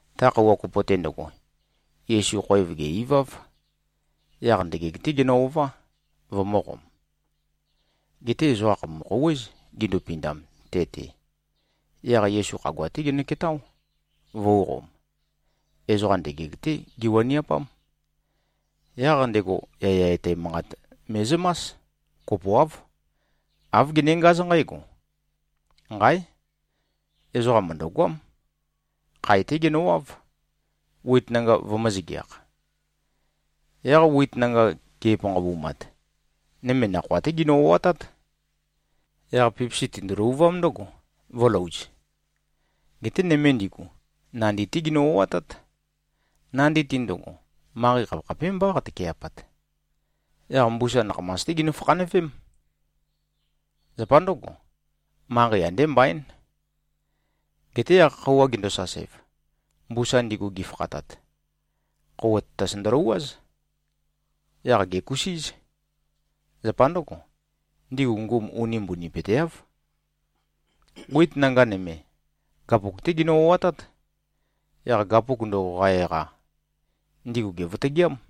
Ta khøuwa kopo-te ndøgo, Yesu khoev gè-iváv. Yaq ndøgeg-té genø-ová, vømø̄qom. Geté ezoqa khàpumu-khouwéz, gindupindam te-te. Yaq Yesu khagua-té genøketáo, vø̄uqom. Ezoqa ndøgeg-té giwaniapám. Yaq ndego yaya etæ manqat me꞉zømás. Kopoáv. Āv genengáz nqǽgo, “Nqáe! Ezoqam mø̀ndøgoám. Khae-té genøwáv, wit nanga vømø̄-zøgeakh. Yaq wit nanga ge꞉panqabumat, nøme nakhoa-té ginø-o꞉atát. Yaq pipisi tindu-løvuvám ndǿgo, vø̄louz. Geté nøme ndigu, nandi-té ginø-o꞉atát. Nandi-te ndøgo, manqei khapekhapémbá qatøke꞉pat. Yaq mbusa nakhamas-té ginø-fakhanøvém. Zapa ndǿgo, manqei andé mbaín. Geté yaq, khøuwa gendosasev, mbusa ndigu gifakhatat, khøuwa tatas ndølouwáz. Yaq gèkusíz. Zapa ndǿgo, ndigu ngum uni mbunipøteáv. Wit nanga nøme, gapuk-té ginø-o꞉atát. Yaq gapuk ndøgo qa-eqa, ndigu gèvøtøgeám.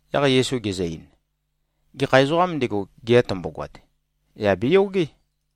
Yaq Yesu gezø-ein, “Gekha ezoqām ndego, gea tømbogoat, yà beyogé.”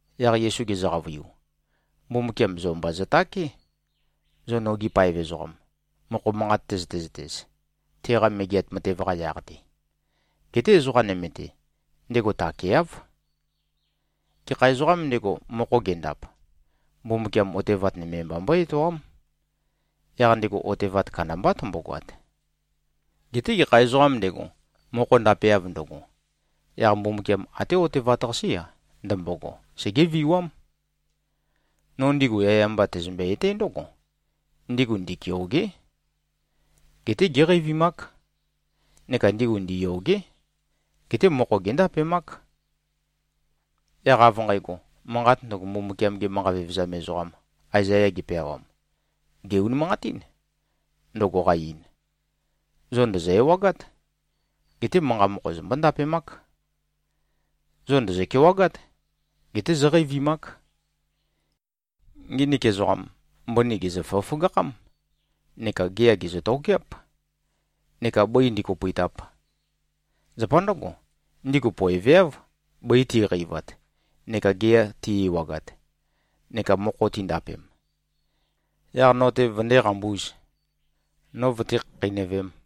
Yaq Yesu gezø-qavøiu, “Mbumbukiam zo mba zøtáke, zo nogi paev ezoqam, mokho manqat tøzøte-zøtez, teqa Megeat Matev-qa yaq-te. Geté ezoqa nøme-te, ndego takeáv. Gekha ezoqām ndego, mokho gendap, Mbumbukiam otevat nøme mba mbøé-etoám. Yaq ndego otevat kandambá tømbogoat. Geté gekha ezoqām ndego, mokho ndapeav ndøgo, yaq Mbumbukiam até otevat-qasé-a, ndømbogo, segéviwám. No ndigu yaya mba tæzømbe-etǽ ndǿgo: Ndigu ndikeôgé. Geté géqeivimák. Neka ndigu ndiyôgé. Geté mokho géndapemák. Yaq av nqægo, manqat ndøgo, Mbumbukiam-ge manqa vevezam ezoqam Aezaya gepeawam, gè-unimanqatín, ndøgo qa-ein, ‘Zo ndòzo-ewagát. Geté manqa mokho zombó-ndapemák. Zo ndòzo-kewagát. Geté zóqeivimák. Nginik ezoqam, mbøni gèzø-føgøføgakhám. Neka gea gèzø-tokeáp, neka bǿi ndīkōpø̄ītāp. Zapa ndǿgo, ndigu poeveáv, bøi ti꞉qeivat neka gea ti꞉-ewagat, neka mokho tindapem, yaq no-te vøndé-qambūz, no vøté-khakheinøvēm.’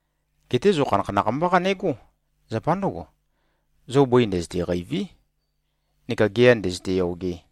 Geté zo khanakhanakh mbá qanegó. Zapa ndǿgo, zo bøi ndøzøte-qêiví neka gea ndø̄zø̄tē-yōgē.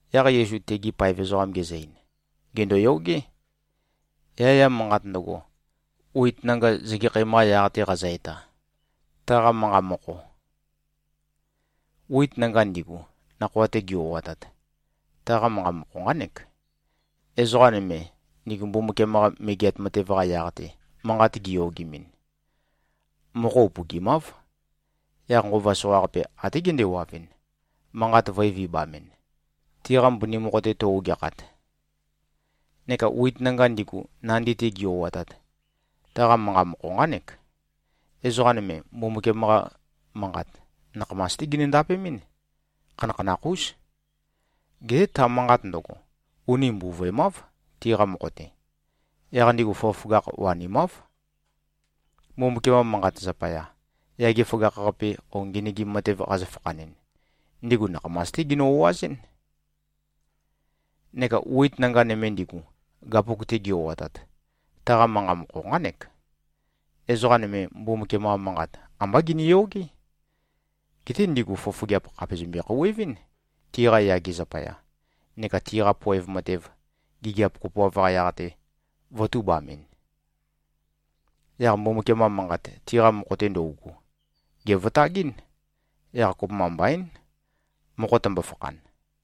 Yaq Yesu tegi paev ezoqam gezø-ein, “Gèndoyogé, yaya manqat ndøgo, wit nanga zøgekhæm-qa yaq-te qazø-eta, taqa manqa mokho. Wit nanga ndigu, nakhoa-te gi-o꞉atat, taqa manqa mokho nqánek: Ezoqa nøme, ndigu Mbumbukiam-qa Megeat Matev-qa yaq-te, manqat giyogemɨn, mokho upøgimáv. Yaq nqova soqaqape, até gendewavɨn, manqat vø̄e-vibamɨn, tiqa mbøni mokho-te tøu-ogeakhat. Neka wit nanga ndigu, nandi-te gi-o꞉atat, taqa manqa mokho nqánek: Ezoqa nøme, Mbumbukiam-qa Manqat nakhamas-té ginø-ndapemɨ́n. Khanakhanakh-ús. Geté ta manqat ndøgo, uni mbuvøemáv, tiqa mokho-te. Yaq ndigu føgøføgakh wanimáv. Mbumbukiam-qa Manqat zapaya, yage føgakh-qape o ngenøgim matev qazø-fakhanɨn, ndigu nakhamas-té ginø-o꞉azɨ́n. Neka wit nanga nøme ndigu, gapuk-te gi-o꞉atat, taqa manqa mokho nqánek: Ezoqa nøme, Mbumbukiam-qa Manqat ambá giniyogé. Geté ndigu fofogeap khàpe zømbe-khouwevɨ́n, tiqa yage zapaya, neka tiqa poev matev, gigiap kopoav-qa yaq-te, vø̄tubamɨn. Yaq Mbumbukiam-qa Manqat, tiqa mokho-te ndøugu, gèvøtagɨ́n. Yaq kopømba mbaín, mokho tømbo-fakhan.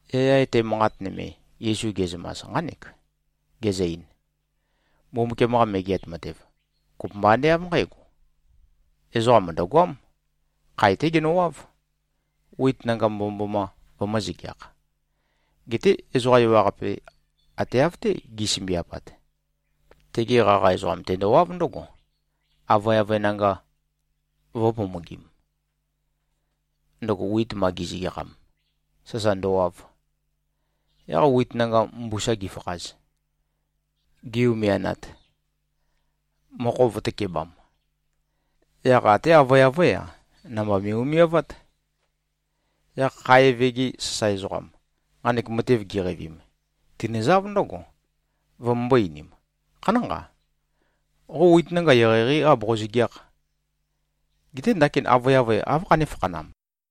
Yaya etæ manqat nøme, Yesu ge꞉zømas, nqánek. Gezø-ein, “Mbumbukiam-qa Megeat Matev, kopømba ande av nqǽgo: Ezoqa mø̀ndøgoám. Khae-té genøwáv, wit nanga mbomømboma vømø̄-zøgeakh. Geté ezoqa ewaqape ate av-té gi꞉sømbiapat, tege qaqa ezoqam tendowáv ndǿgo, avøeavøe nanga vø̄pomogim, ndøgo wit ma gi꞉zøgeakham, sasa ndøwav. Yaq wit nanga mbusa gifakhaz, gi-umianat, mokho vø̄tøkebam, yaq até avøeavøé-a, namba me꞉-umiavát. Yaq khae eve-gi sasae ezoqam, nqanek matev giqeivim, tinøzáv ndǿgo, vømømbō-einim, ‘Khanánqa. Qo wit nanga eqeieqeí aboqo-zøgeákh. Geté ndakin avøeavøe áv khané-fakhanam?’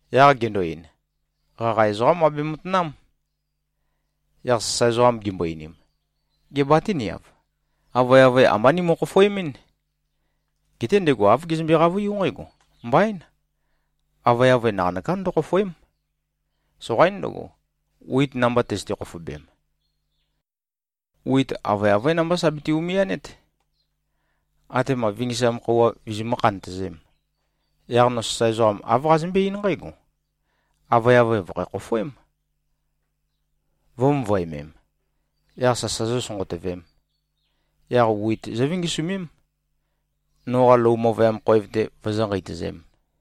Yaq gendo-ein, ‘Qaqa ezoqám abe-matanám.’ Yaq sasae ezoqam gimbo-einim, ‘Gê, batíniav? Avøeavøe ambá nimø-khofoemɨ́n.’ Geté ndego āv gezømbe-qavøiú nqǽgo, ‘Mbaín. Avøeavøe naqanøkā ndøkhofòe᷄m. Soqaín ndøgo, wit namba tøzøte-khofobem. Wit avøeavøé namba sa bete-umianét, atema vingisam khøuwa vizimǿ-khantøzēm. Yaq no sasae ezoqam āv qazømbé-eín nqǽgo, “Avøeavøe vø̀khæ-khofoém, vø̄-møvøemem, yaq sasa zósønqotøvēm. Yaq wit zóvingisumém, noqa lou møvøyam khoev-te vozó-nqeitøzēm.”’”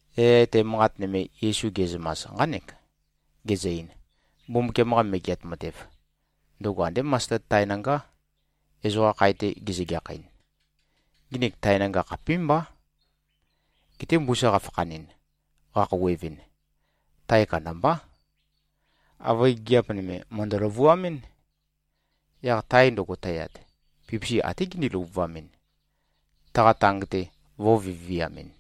Yaya etæ manqat nøme, Yesu ge꞉zømas, nqánek. Gezø-ein, “Mbumbukiam-qa Megeat Matev, ndøgo andé masted tae nangá, ezoqa khae-te gezøgeakhɨn. Nginik tae nanga khapímbá. Geté mbusa qafakhanɨn, qakhouwevɨn, tae kandambá. Avøe gigiap nøme mø̀ndø-løvuamɨ́n. Yaq tae ndøgo tøyat, pipisi até gindi-løvuvamɨn, taqa tang-te vō꞉viviamɨn.”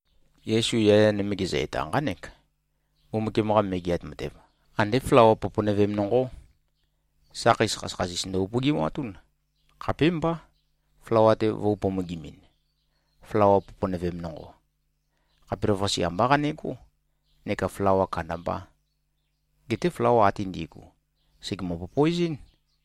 Yesu yaya nøme gezø-eta, nqánek, “Mbumbukiam-qa Megeat Matev, andé flawa poponøvem nonqó. Sakheis khasøkhasis ndø-upøgimatún, khapémbá, flawa-te vø̄u-pomogimimin. Flawa poponøvem nonqo, khapelavøqase ambá qanegó, neka flawa kandambā. Geté flawa ate ndi꞉gu, sègemø-popoezɨ́n.”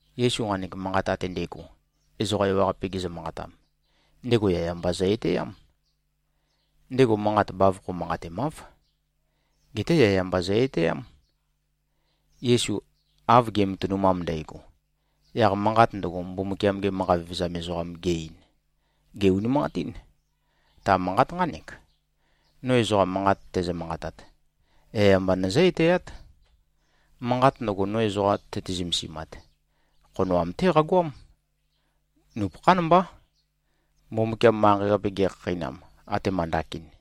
Yesu nqanek manqat ate ndægo, ezoqa ewaqape gezø-manqatam, ndego yaya mba zø-etæám. Ndego manqat bavokho manqatemáv. Geté yaya mba zø-etæám. Yesu av ge꞉matønumam ndægo, yaq manqat ndøgo, Mbumbukiam-ge manqa vevezam ezoqam ge꞉-ein, gè-unimanqatín. Ta manqat nqánek, “No ezoqa manqat tæzø-manqatat, yaya mba nøzǿ-etæát. Manqat ndøgo, no ezoqa tøte-zømesimat, khonoam-té qagoám. Nupøkhán mbá, Mbumbukiam manqei-qape gekhakheinam, atema ndakin.”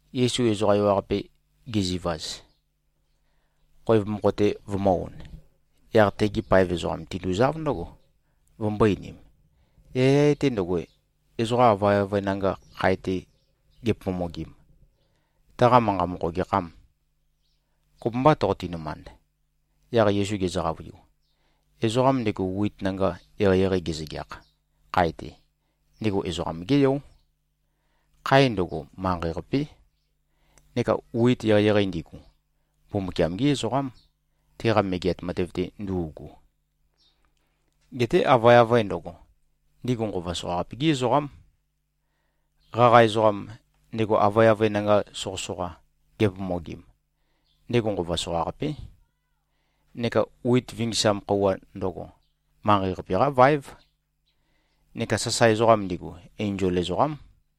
Yesu ezoqa ewaqape gezivaz, khoev mokho-te vømø̄-on, yaq tegi paev ezoqam tinduzáv ndǿgo, vømbō-einim, “Yaya etæ ndøgo, ezoqa avøeavøe nanga khae-te gepomogim, taqa manqa mokho gekhâm? Kopømbâ toqoti-nømand?” Yaq Yesu gezø-qavøiu, “Ezoqam ndego wit nanga eqeieqei gezøgeakh, khae-te, ndego Ezoqam-gé Yó. Khae ndøgo, manqei-qapé, neka wit eqeieqei ndigu, Mbumbukiam-gí ezoqám, teqa Megeat Matev-te ndu꞉gu. Geté avøeavøe ndøgo, ndigu nqova soqaqape-gí ezoqám. Qaqa ezoqam, ndego avøeavøe nanga soqøsoqa gepomogim, ndego nqova soqaqapé. Neka wit vingisam khøuwa ndøgo, manqei-qape-qá vaév. Neka sasae ezoqam ndigu, enzol ezoqám.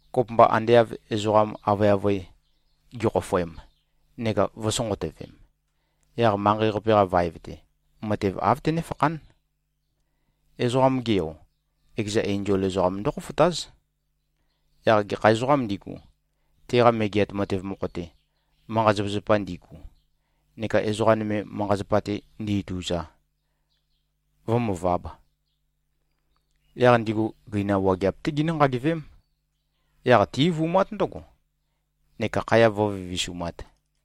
Kopømba ande av ezoqam avøeavøe gikhofoem neka vø̄sonqotøvem, yaq manqei-qape-qa vaev-te, matev āv tønéfakhán. Ezoqam-ge Yo, ekeza enzol ezoqam ndókhofotáz, yaq gekha ezoqām ndigu, teqa Megeat Matev mokho-te, manqa-zapazapa ndigu neka ezoqa nøme manqa-zapa-te ndi-ituza, vǿmøvāb. Yaq ndigu gøinam wageap-té ginǿ-nqagivém. Yaq tí-eivumát ndǿgo, neka khaya vǿvivisumāt.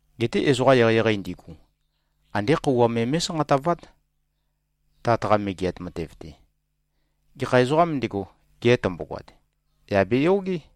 Geté ezoqa eqeieqei ndigu, andé khøuwa me mé꞉sanqatavát, Tat-qa Megeat Matev-te. Gekha ezoqām ndego, gea tømbogoat, yà beyogé.”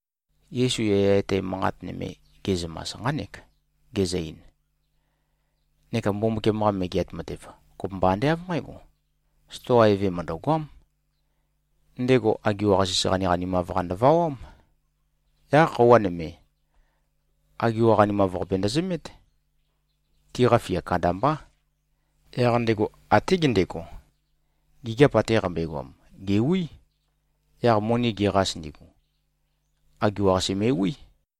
Yesu yaya etæ manqat nøme ge꞉zømas, nqánek. Gezø-ein, “Neka Mbumbukiam-qa Megeat Matev, kopømba ande av nqǽgo: Stoa eve mø̀ndøgoám. Ndego agiwa-qasis qaniqanimav-qa ndøvawám. Yaq khøuwa nøme, agiwa qanimav-qapi ndøzømét. Tiqa fia kandambá. Yaq ndego até gendego, gigiap ate qambøegoam, gèwí. Yaq moni geqas ndigu, agiwa-qasi me꞉wí.”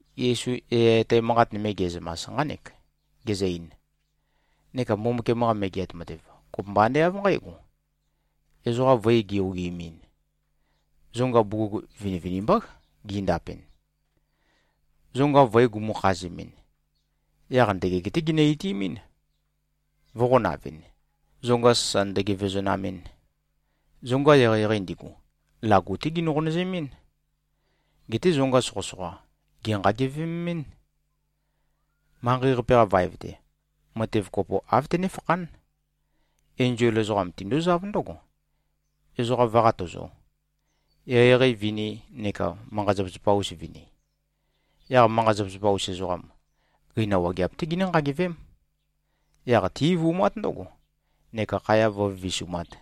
Yesu yaya etæ manqat nøme ge꞉zømas, nqánek. Gezø-ein, “Neka Mbumbukiam-qa Megeat Matev, kopømba ande av nqǽgo: Ezoqa voe gi-ogimin, zonga bugug vinivinimbá gindapɨn. Zonga voe gumu-khazemɨn, yaq ndøgeg-té ginø-itimín, vø̄qonavɨn, zonga sasa ndøgevezonamɨn. Zonga eqeieqei ndigu, lagu-té ginø-qonøzemɨ́n. Geté zonga soqøsoqa, gènqagevemɨ́n. Manqei-qape-qa vaev-te, matev kopo āv tønéfakhán. Enzol ezoqam tindúzáv ndǿgo, ezoqa vǿ-qatøzō, eqeieqei vini neka manqa-zapazapa-us vini. Yaq manqa-zapazapa-us ezoqam, gøinam wageap-té ginǿ-nqagivém. Yaq tí-eivumát ndǿgo, neka khaya vǿvivisumāt.”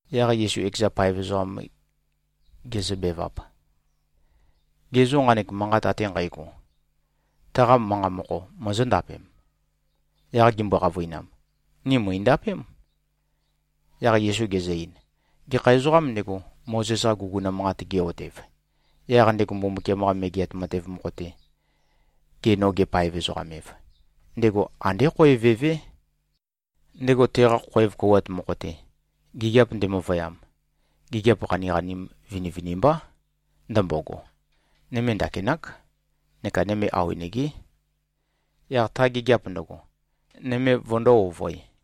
Yaq Yesu ekeza paev ezoqam gezøbevap, “Ge zô, nqanek manqat ate nqægo, taqa manqa mokho mozóndapem?” Yaq gimbo-qavøinam, “Ni mø̀indapém.” Yaq Yesu gezø-ein, “Gekha ezoqām ndego, Mozes-qa guguna manqat ge꞉-otev, yaq ndego Mbumbukiam-qa Megeat Matev mokho-te, ge-noge-paev-ezoqam-ev, ndego andé khoev evé. Ndego teqa khoev kouwat mokho-te, gigiap ndemøvøyam, gigiap qaniqanim vinivinimbá ndømbogo, nøme ndakinák neka nøme awenegé, yaq ta gigiap ndøgo, nøme vøndō-ovøe.”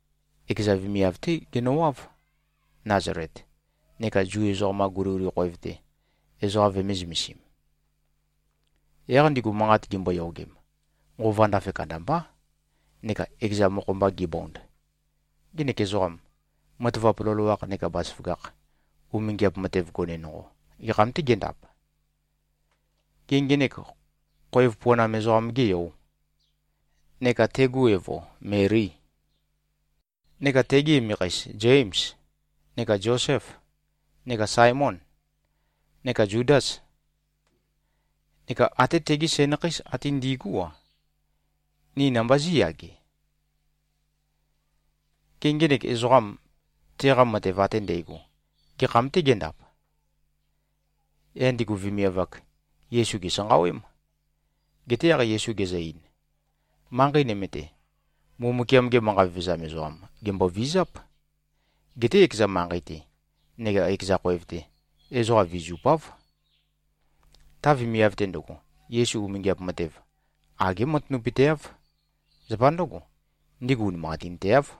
ekeza vemiav-té genøwáv, Nazalet, neka Zu ezoqam-qa guliguli khoev-te, ezoqa vøme-zø̄mesim. Yaq ndigu manqat gimboyogem, nqova ndafe kandambá neka ekeza mokho-mba gibond, “Ngenek ezoqam, matavap loloakh neka bazaføgakh, umingiap matev gone nonqo, gekham-tê gendap? Gê, ngenek khoev puanam ezoqam-gê yò? Neka tegu evo, Melî? Neka tegi emekheis Zêms, neka Zosêf, neka Saemôn, neka Zudâs? Neka até tegi sænakheis ate ndi꞉gú-a, ni namba zí꞉yage? Gê, ngenek ezoqam, teqa matev ate ndægo gekham-tê gendap?” Yaq ndigu vemiav-ak, Yesu gèsanqawém. Geté yaq Yesu gezø-ein, “Manqei nøme-te, Mbumbukiam-ge manqa vevezam ezoqam, gèmbovizáp. Geté ekeza manqei-te neka ekeza khoev-te, ezoqa vizupáv.” Ta vemiav-te ndøgo, Yesu umingiap matev, agé matanapøteáv. Zapa ndǿgo, ndigu unimanqatinteáv.